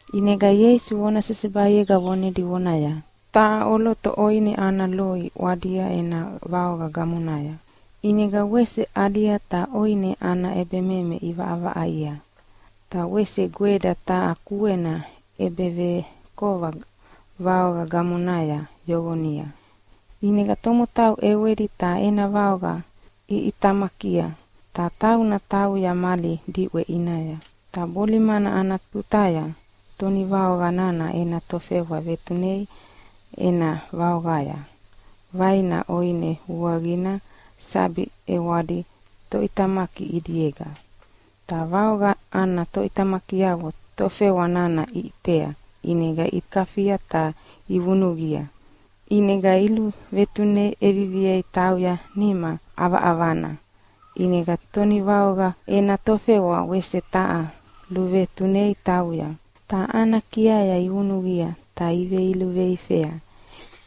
ʼInega Ieisu vona sesebaiega vonedi vonaya, “Taha ʼoloto ʼoine ana loi ʼwadia ena vaoqa gamonaya, ʼinega wese ʼalia ta ʼoine ana ʼebememe ʼivaʼavaʼaia. Ta wese gweda taha kuena ʼebevekova vaoqa gamonaya yoqonia. ʼInega tomotau ʼewedi ta ena vaoqa iʼitamakia, ta tauna tauya mali diʼwe ʼinaya. “Ta bolimana ana tutaya tonivaoqa nana ena tofewa vetunea ena vaoqaya vaina ʼoine vuaqina sabi ʼewadi toʼitamaki ʼidiega. Ta vaoqa ana toʼitamakiavo tofewa nana iʼitea ʼinega ikafia ta ivunuqia. ʼInega iluvetune ʼeviviei tauya nima ʼavaʼavana. ʼInega tonivaoqa ena tofewa wese taha luvetunei tauya, ta ana kiaya ivunuqia ta iveilivu veifea.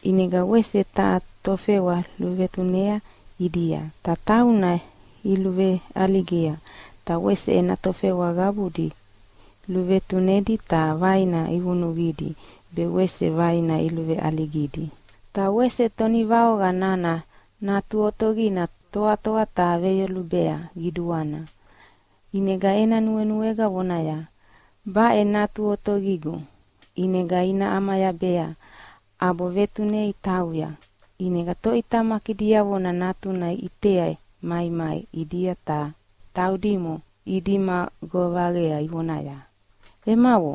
ʼInega wese taha tofewa luvetunea ʼidia, ta tauna iluveʼaligia. Ta wese ena tofewa qabudi luvetunedi ta vaina ivunuqidi be wese vaina iluveʼaligidi. “Ta wese tonivaoqa nana natu otaqina toatoa ta veyolubea qiduana. ʼInega ena nuenuega vonaya, ‘Baʼe natu otaqigu, ʼinega ina ʼamayabea’, ʼabo vetunei tauya. ʼInega toʼitamaki diavona natuna iʼitea maimai ʼidia ta taudimo idima govaqa ivonaya, ‘Emavo,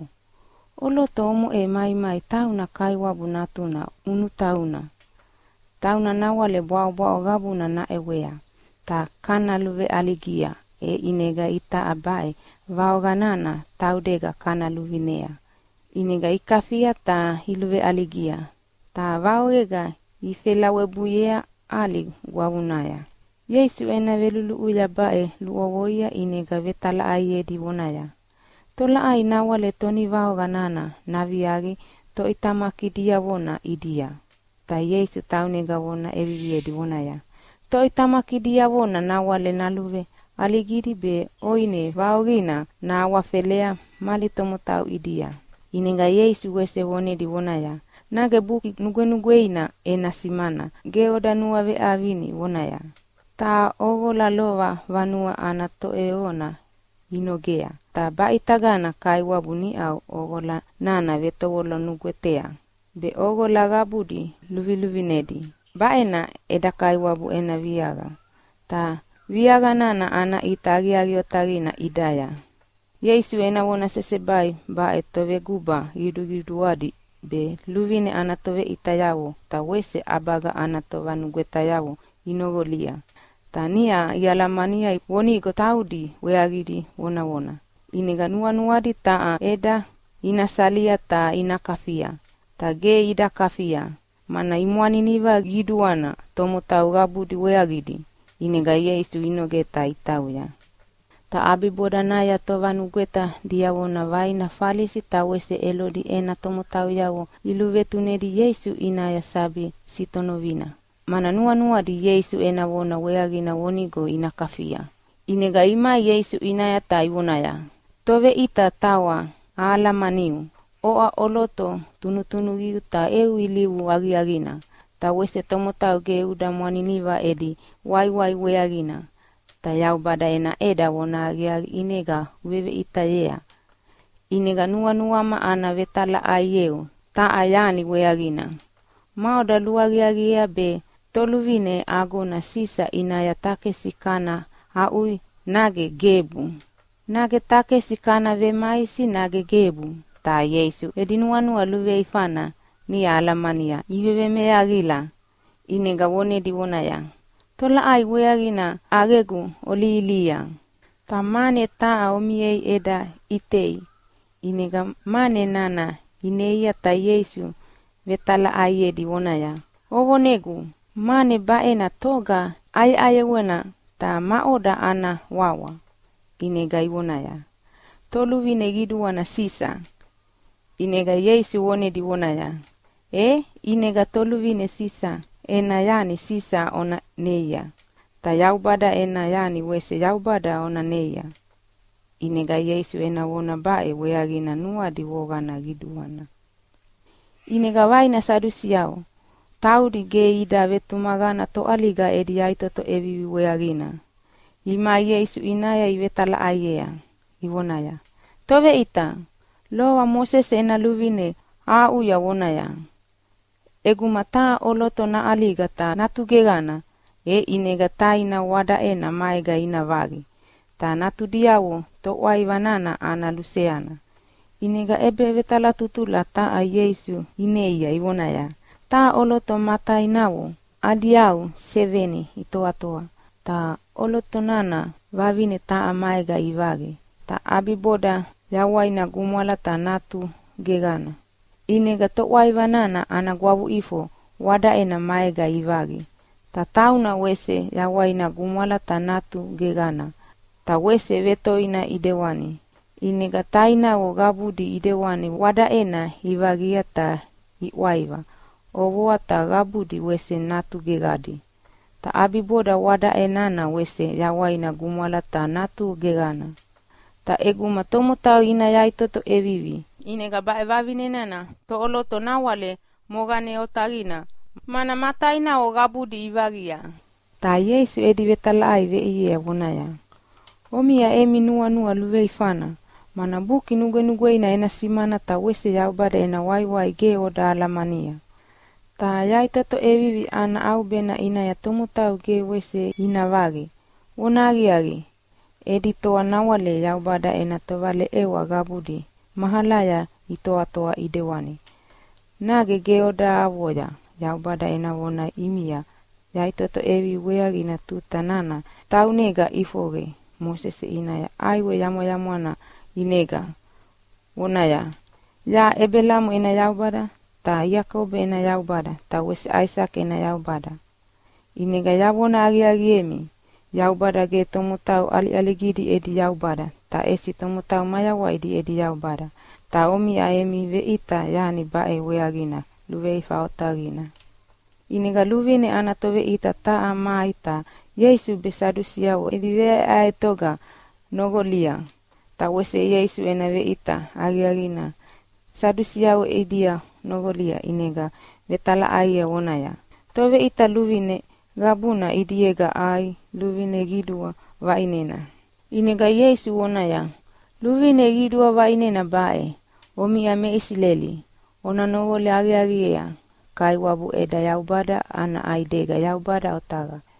ʼoloto omoʼe maimai tauna kaiwabu natuna ʼunutauna. Tauna nawale bwaʼobwaʼo qabuna naʼewea. Ta kana luveʼaligia e ʼinega itaʼa baʼe vaoqa nana taudega kana luvinea.’ ʼInega ikafia ta iluveʼaligia, ta vaoqega ifelawebuiea ʼali gwavuya.” Ieisu ena veluluʼuya baʼe luʼovoia ʼinega vetalaʼaiedi vonaya, “Tolaʼai nawale tonivaoqa nana naviaqi toʼitamaki diavona ʼidia?” Ta Ieisu taunega vona ʼeviviedi vonaya, “Toʼitamaki diavona nawale naluveʼaligidi be ʼoine vaoqina nahawafelea mali tomotau ʼidia.” ʼInega Ieisu wese vonedi vonaya, “Nage Buki Nugwenugweina ena simana ge oda nuaveʼavinia vonaya, ‘Taha ʼoqola lova vanue ana toʼeyoqona inogea, ta baʼitagana Kaiwabu niʼau ʼoqola nana vetovolo nugwetea be ʼoqola qabudi luviluvinedi. Baʼena eda Kaiwabu ena viaqa, ta viaqa nana ana ʼita aqiaqi otaqina ʼidaya.’” Ieisu ena vona sesebai baʼe toveguba qiduqiduadi be luvine ana toveʼitayavo ta wese ʼabaga ana tovanugwetayavo inoqolia, ta niʼa ialamania vonigo taudi weaqidi vonavona. ʼInega nuanuadi taha ʼeda ina salia ta ina kafia. Ta ge ida kafia, mana imwaniniva qiduana tomotau qabudi weaqidi, ʼinega Ieisu inogea ta itauya. Ta ʼabibodanaya tovanugweta diavona vaina Falisi ta wese Elodi ena tomotauyavo iluvetunedi Ieisu ʼinaya sabi sitonovina. Mana nuanuadi Ieisu ena vona weaqina vonigo ina kafia. ʼInega imai Ieisu ʼinaya ta ivonaya, “Toveʼita tawa ahalamaniu, oʼa ʼoloto tunutunuqiu ta eu ilivu aqiaqina. Ta wese tomotau ge uda mwaniniva edi waiwai weaqina. Ta Yaubada ena ʼeda vonahaqiaqi ʼinega uveveʼitayea. ʼInega nuanuama ana vetalaʼaieu taha yani weaqina. Maʼoda luaqiaqiea be toluvine agona Sisa ʼinaya takesi kana aʼuya nage gebu? Nage takesi kana vemaisi nage gebu?” Ta Ieisu edi nuanua luveifana niʼa alamania ivevemeaqila, ʼinega vonedi vonaya, “Tolaʼai weaqina ʼaqegu olihilihia? Ta mane taha omiei eda ʼitei!” ʼInega mane nana ineia ta Ieisu vetalaʼaiedi vonaya, “Ovonegu, mane baʼena toga ʼayeʼayewana ta maʼoda ana wawa?” ʼInega ivoneaya, “Toluvine qiduana Sisa.” ʼInega Ieisu vonedi vonaya, “E ʼinega toluvine Sisa ena yani Sisa ona neia, ta Yaubada ena yani wese Yaubada ona neia!” ʼInega Ieisu ena vona baʼe weaqina nuadi voqana qiduana. ʼInega vaina Sadusiavo, taudi ge ida vetumaqana toʼaliga edi yaʼitoto ʼevivi weaqina, imai Ieisu ʼinaya ivetalaʼaiea, ivonaya, “Toveʼita, lova Mosese ena luvine aʼuya vonaya, ‘ʼEguma taha ʼoloto naʼaliga ta natu geqana, e ʼinega taina wadaʼena maega ina vaqi, ta natudiavo toʼwaiva nana ana luseana.’” ʼInega ʼebevetalatutula taha Ieisu ineia ivonaya, “Taha ʼoloto ma tainavo adi yau seveni itoatoa. Ta ʼoloto nana vavine taha maega ivaqi, ta ʼabiboda yawaina gumwala ta natu geqana. ʼInega toʼwaiva nana ana gwavuʼifo wadaʼena maega ivaqi. Ta tauna wese yawaina gumwala ta natu geqana. Ta wese vetoina ʼidewani. ʼInega tainavo qabudi ʼidewani wadaʼena ivaqia ta iʼwaiva ʼovoa ta qabudi wese natu geqadi. Ta ʼabiboda wadaʼe nana wese yawaina gumwala ta natu geqana. Ta ʼeguma tomotau ina yaʼitoto ʼevivi, ʼinega baʼe vavine nana toʼoloto nawale moqane otaqina, mana ma tainavo qabudi ivaqia?” Ta Ieisu edi vetalaʼai veʼiea vonaya, “Omiʼa emi nuanua luveifana, mana Buki Nugwenugweina ena simana ta wese Yaubada ena waiwai ge oda alamania. Ta yaʼitoto ʼevivi ana ʼaubena ʼinaya tomotau ge wese ina vaqi. Vonahaqiaqi, edi toa nawale Yaubada ena tovaleʼewa qabudi mahalaya itoatoa ʼidewani. Nage ge oda avoya Yaubada ena vona ʼimia yaʼitoto ʼevivi weaqina tuta nana taunega ʼifoqe Mosese ʼinaya ʼaiwe yamwayamwana ʼinega, vonaya, ‘Yaʼa Ebelamo ena Yaubada ta Iakobo ena Yaubada ta wese Aisake ena Yaubada.’ ʼInega yavona aqiaqiemi, Yaubada ge tomotau ʼaliʼaligidi edi Yaubada ta ʼesi tomotau mayawaidi edi Yaubada. Ta omiʼa emi veʼita yani baʼe weaqina luveifa otaqina.” ʼInega luvine ana toveʼita taha mai ta Ieisu be Sadusiavo edi veʼaeʼaetoga noqolia. Ta wese Ieisu ena veʼita aqiaqina Sadusiavo ʼidia noqolia ʼinega vetalaʼaiea vonaya, “Toveʼita, luvine qabuna ʼidiega ai luvine qidua vaʼinena?” ʼInega Ieisu voneaya, “Luvine qidua vaʼinena baʼe, ‘Omiʼa me Isileli, ona noqola aqiaqi, Kaiwabu eda Yaubada ana ʼaidega Yaubada otaqa.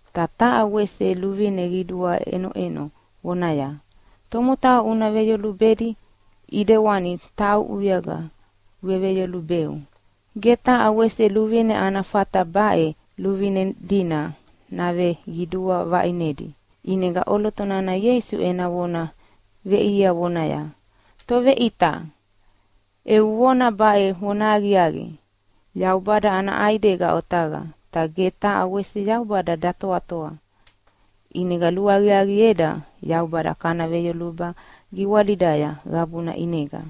Ta taha wese luvine qiduana ʼenoʼeno vonaya, ‘Tomotau una veyolubedi ʼidewani tauʼuyega uveveyolubeu.’ Ge taha wese luvine ana fata baʼe luvine dina naveqidua vaʼinedi.” ʼInega ʼoloto nana Ieisu ena vona veʼiea vonaya, “Toveʼita, eu vona baʼe vonahaqiaqi. Yaubada ana ʼaidega otaqa, ta ge taha wese Yaubada datoatoa. ʼInega luaqiaqieda Yaubada kana veyolubea giwalida qabuna ʼinega,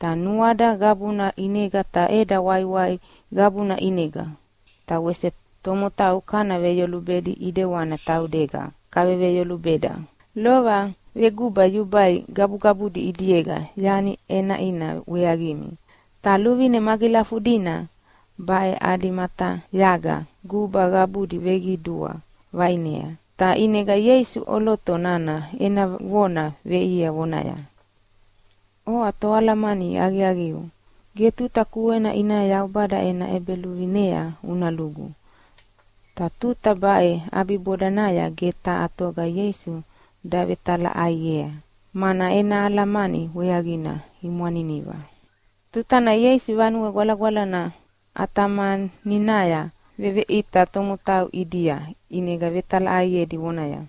ta nuada qabuna ʼinega ta eda waiwai qabuna ʼinega. Ta wese tomotau kana veyolubedi ʼidewana taudega kaveveyolubeda. Lova veguba yubai gabugabudi ʼidiega yani ʼenaʼina weaqimi, ta luvine magilafudina baʼe adi matayaga guba qabudi veqidua vaʼinea.” Ta ʼinega Ieisu ʼoloto nana ena vona veʼiea vonaya, “Oʼa toalamani aqiaqiu, ge tuta kuena ʼinaya Yaubada ena ʼEbeluvinea una lugu.” Ta tuta baʼe ʼabibodanaya ge taha toga Ieisu davetalaʼaiei, mana ena alamani weaqina imwaniniva. Tutana Ieisu Vanue Gwalagwalana ʼatamaninaya veveʼita tomotau ʼidia ʼinega vetalaʼaiedi vonaya,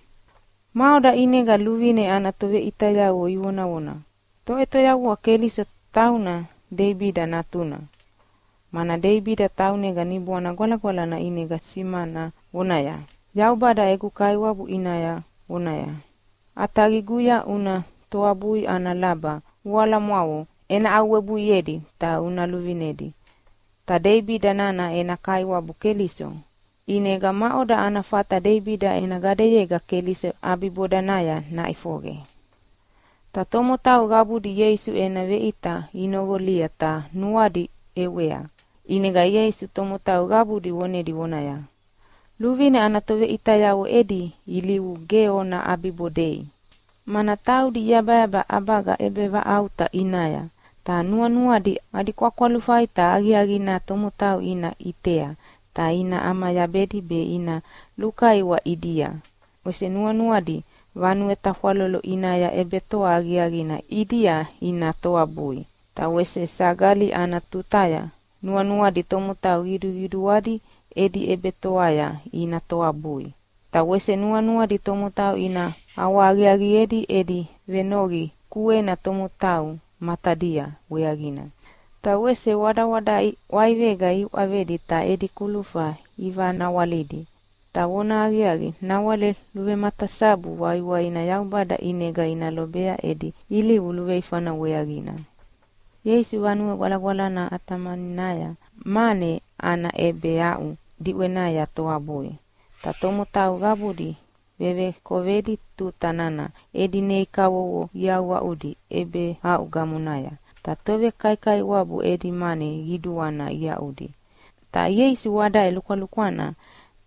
“Maʼoda ʼinega luvine ana toveʼitayavo ivonavona Toʼetoyavua Keliso tauna Deibida natuna? Mana Deibida taunega Niboana Gwalagwalana ʼinega simana vonaya, ‘Yaubada egu Kaiwabu ʼinaya vonaya, “ʼAtaqiguya una toabui ana laba voalamwavo ena aʼuwebuiedi ta una luvinedi.” ’ Ta Deibida nana ena Kaiwabu Keliso. ʼInega maʼoda ana fata Deibida ena gadeyega Keliso ʼabibodanaya naʼifoqe?” Ta tomotau qabudi Ieisu ena veʼita inoqolia ta nuadi ʼewea. ʼInega Ieisu tomotau qabudi vonedi vonaya, “Luvine ana toveʼitayavo edi ilivu ge ona ʼabibodei. Mana taudi iyabayaba ʼabaga ʼebevaʼauta ʼinaya, ta nuanuadi adi kwakwalufai ta aqiaqina tomotau ina ʼitea ta ina ʼamayabedi be ina lukaiwa ʼidia. Ta wese nuanuadi vanue tafwalolo ʼinaya ʼebetoa aqiaqina ʼidia ina toabui, ta wese sagali ana tutaya nuanuadi tomotau qiduqiduadi edi ʼebetoaya ina toabui. Ta wese nuanuadi tomotau ina ʼawahaqiaqiedi edi venoqi kuena tomotau matadia weaqina. Ta wese wadawadaʼe ʼwaivega iuʼavedi ta edi kulufa ivanawalidi. Ta vonahaqiaqi nawale luvematasabu waiwaina Yaubada ʼinega ina lobea edi ilivu luveifana weaqina.” Ieisu Vanue Gwalagwalana ʼatamaninaya mane ana ʼebeaʼu diʼwenaya toabui, ta tomotau qabudi vevekovedi tuta nana edi nei kavovo iaʼuaʼudi ʼebeaʼu gamonaya. Ta tovekaikaiwabu edi mane qiduana iaʼudi. Ta Ieisu wadaʼe lukwalukwana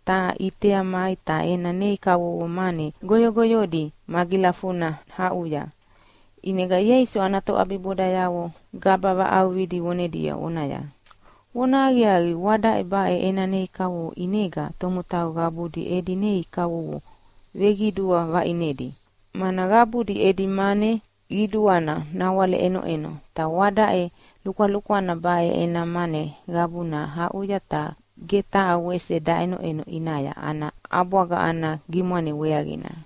taha ʼitea mai ta ena nei kavovo mane goyogoyodi magilafuna aʼuya. ʼInega Ieisu ana toʼabibodayavo gaba vaʼauqidi vonedi vonaya, “Vonahaqiaqi, wadaʼe baʼe ena nei kavovo ʼinega tomotau qabudi edi nei kavovo veqidua vaʼinedi. Mana qabudi edi mane qiduana nawale ʼenoʼeno, ta wadaʼe lukwalukwana baʼe ena mane qabuna aʼuya, ta ge taha wese daʼenoʼeno ʼinaya ana ʼabwaga ana gimwane weaqina.”